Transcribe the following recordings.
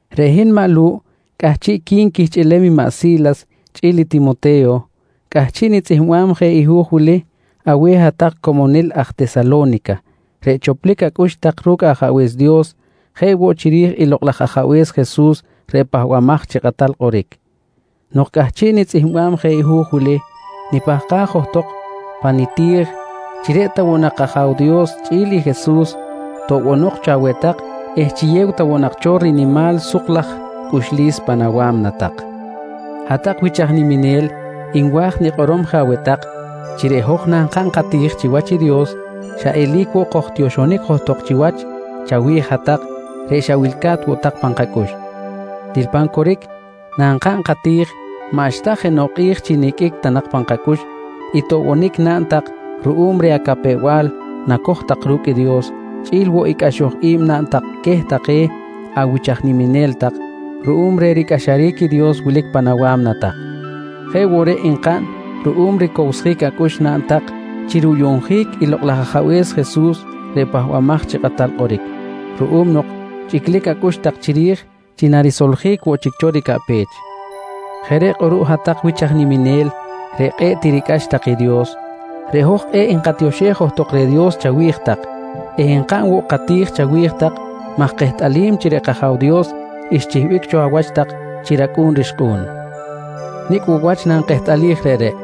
Reꞌ hin maꞌ Lu̱ꞌ chi cꞌahchiꞌqui̱n quihchꞌilem i maꞌ Si̱las chꞌi̱l i Timote̱yo, cꞌahchiꞌ nitzꞌihmbam je hu̱j wili aweh hat-tak comonil aj niminel aj Tesalo̱nica reꞌ choplic acꞌux tak ru̱cꞌ Ajabe̱s Dios jeꞌ woꞌ chiri̱j i Lokꞌ laj Ajabe̱s Jesus reꞌ Pahbamaj chi Kꞌatal Kꞌoric. Nok cꞌahchiꞌ nitzꞌihmbam je hu̱j wili, nipahkaj johtok pa niti̱j chi reꞌ ta woꞌ nak kAja̱w Dios chꞌi̱l i Jesus toꞌbonok cho aweh tak eh chiyew ta woꞌ nak cho rinimal suk laj cꞌuxlis pan awa̱mna tak. Hat-tak wich aj niminel nwa̱j nikꞌorom je aweh tak chi reꞌ hoj nankaꞌn kati̱j chiwach i Dios, xa eli̱c woꞌ kojtioxonic johtok chiwach chawi̱j hat-tak reꞌ xa wilca̱t woꞌ tak pan kacꞌux. Til pan coric nankaꞌn kati̱j maꞌxta jenoꞌ kꞌi̱j chi niqꞌuic ta nak pan kacꞌux i toꞌbonic naꞌn tak ruꞌum reh acapew-bal nacoj tak ru̱cꞌ i Dios, chꞌi̱l woꞌ i cꞌaxoj i̱b naꞌn tak queh take awich aj niminel tak ruꞌum reh ricꞌaxaric i Dios wilic pan awa̱mna tak. Jeꞌ woꞌ reꞌ nkaꞌn ruꞌum ricowsjic acꞌux naꞌn tak chi ruyuꞌnjic i Lokꞌ laj Ajabe̱s Jesus reꞌ Pahbamaj chi Kꞌatal Kꞌoric, ruꞌum nok chꞌiclic acꞌux tak chiri̱j chi narisoljic woꞌ chic cho ricaꞌpech. Jeꞌ reꞌ kꞌuruꞌ hat-tak wich aj niminel reꞌ kꞌe̱ꞌ tiricꞌax tak i Dios, reꞌ hoj kꞌe̱ꞌ nkatioxej johtok reh i Dios chawi̱j tak eh nkaꞌn woꞌ kati̱j chawi̱j tak maj kehtꞌalim chi reꞌ kAja̱w Dios xchihbic cho awach tak chi racꞌu̱n rixkꞌu̱n. Nicꞌ woꞌ wach nakehtꞌalij reꞌreꞌ?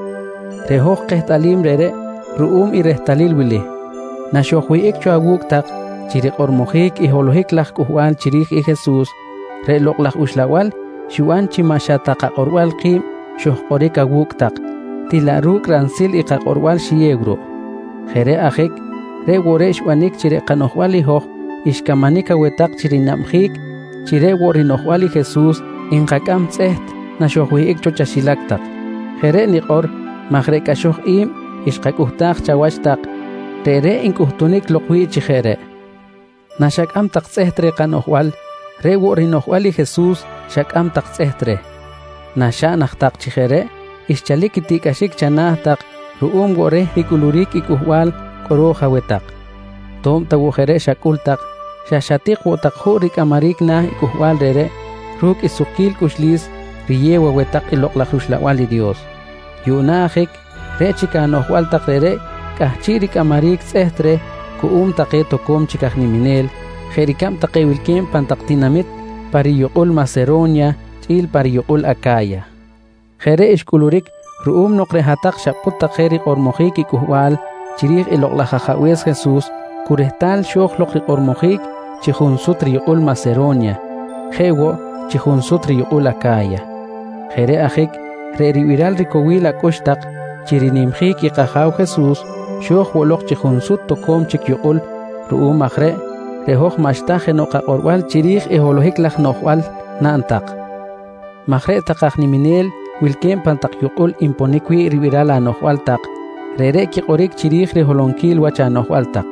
Reꞌ hoj kehtꞌalim reꞌreꞌ ruꞌum i rehtalil wili: Naxojwihꞌic cho awu̱cꞌ tak chi rikꞌormojic i holohic laj cꞌuhbal chiri̱j i Jesus, reꞌ Lokꞌ laj Uxlabal xiban chi maꞌ xa ta kakꞌorbal ki̱b xojkꞌoric cho awu̱cꞌ tak til laꞌ ru̱cꞌ ransil i kakꞌorbal xiyew ruꞌ. Jeꞌ reꞌ ajic reꞌ woꞌ reꞌ xbanic chi reꞌ kanoꞌjbal i hoj xcamanic aweh tak chi rinabjic chi reꞌ woꞌ rinoꞌjbal i Jesus nkacꞌam tzꞌeht naxojwihꞌic cho chaxilac tak. Jeꞌ reꞌ nikꞌor maj reꞌ cꞌaxoj i̱b xkacꞌuhtaj chawach tak, reꞌreꞌ ncꞌuhtunic lok wi̱ꞌ chi jeꞌ reꞌ. Naxacꞌam tak tzꞌeht reh kanoꞌjbal reꞌ woꞌ rinoꞌjbal i Jesus xacꞌam tak tzꞌeht reh. Naxaꞌn aj tak chi jeꞌ reꞌ, xchalic i tiꞌcꞌaxic chana̱ tak ruꞌum woꞌ reh ricꞌuluric i cꞌuhbal kꞌoro̱j aweh tak. To̱b ta woꞌ jeꞌ reꞌ xacꞌul tak xa xatik woꞌ tak juꞌ ricꞌamaric na̱ i cꞌuhbal reꞌreꞌ ru̱cꞌ i sukquil cꞌuxlis riyew aweh tak i Lokꞌ laj rUxlabal i Dios. Yuꞌna ajic reꞌ chic anoꞌjbal tak reꞌreꞌ cꞌahchiꞌ ricꞌamaric tzꞌeht reh cuꞌum take toco̱m chic aj niminel jeꞌ ricab take wilque̱b pan tak tinamit pa riyukꞌul Masero̱nya chꞌi̱l pa riyukꞌul Aca̱ya. Jeꞌ reꞌ xcꞌuluric ruꞌum nok reꞌ hat-tak xapꞌut tak je rikꞌormojic i cꞌuhbal chiri̱j i Lokꞌ laj Ajabe̱s Jesus cu rehtal xo̱j lok rikꞌormojic chi junsut riyukꞌul Masero̱nya jeꞌ woꞌ chi junsut riyukꞌul Aca̱ya. Jeꞌ reꞌ ajic reꞌ ribiral ricowil acꞌux tak chi rinimjic i kAja̱w Jesus xo̱j woꞌ lok chi junsut take toco̱m chic yukꞌul. Ruꞌum aj reꞌ, reꞌ hoj maꞌxta jenoꞌ kakꞌorbal chiri̱j i holohic laj noꞌjbal naꞌn tak maj reꞌ take aj niminel wilque̱b pan tak yukꞌul nponic wi̱ꞌ ribiral anoꞌjbal tak reꞌreꞌ quikꞌoric chiri̱j riholonquil wach anoꞌjbal tak.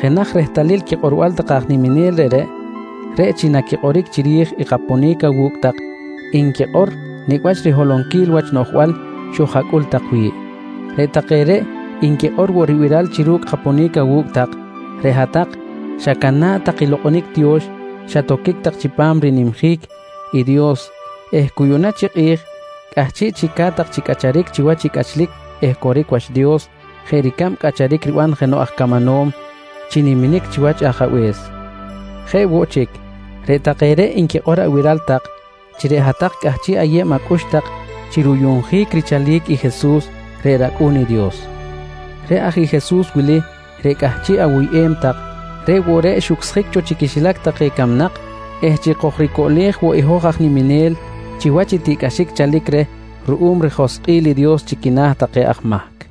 Jenaj rehtalil quikꞌorbal take aj niminel reꞌreꞌ, reꞌ chi naquikꞌoric chiri̱j i kaponic awu̱cꞌ tak nquikꞌor nicꞌ wach riholonquil wach noꞌjbal xoj-acꞌul tak wi̱ꞌ. Reꞌ take reꞌ nquikꞌor woꞌ ribiral chi ru̱cꞌ kaponic awu̱cꞌ tak, reꞌ hat-tak xacana̱ꞌ tak i lokꞌonic tiyo̱x xatoquic tak chipam rinimjic i Dios eh cu yuꞌna chi kꞌi̱j cꞌahchiꞌ chic ca̱t tak chi cꞌacharic chiwach i cꞌachlic eh coric wach Dios jeꞌ ricab cꞌacharic riban jenoꞌ aj camanom chi niminic chiwach i ajabe̱s. Jeꞌ woꞌ chic, reꞌ take reꞌ nquikꞌor abiral tak chi reꞌ hat-tak cꞌahchiꞌ ayeb acꞌux tak chi ruyuꞌnjic richalic i Jesus reꞌ rAcꞌu̱n i Dios. Reꞌ aj i Jesus wili reꞌ cꞌahchiꞌ awuyꞌem tak, reꞌ woꞌ reꞌ xucsjic cho chi quixilac take camnak eh chi kojricoꞌlej woꞌ i hoj aj niminel chiwach i tiꞌcꞌaxic chalic reh ruꞌum rijoskꞌil i Dios chi quina̱ take aj mahc.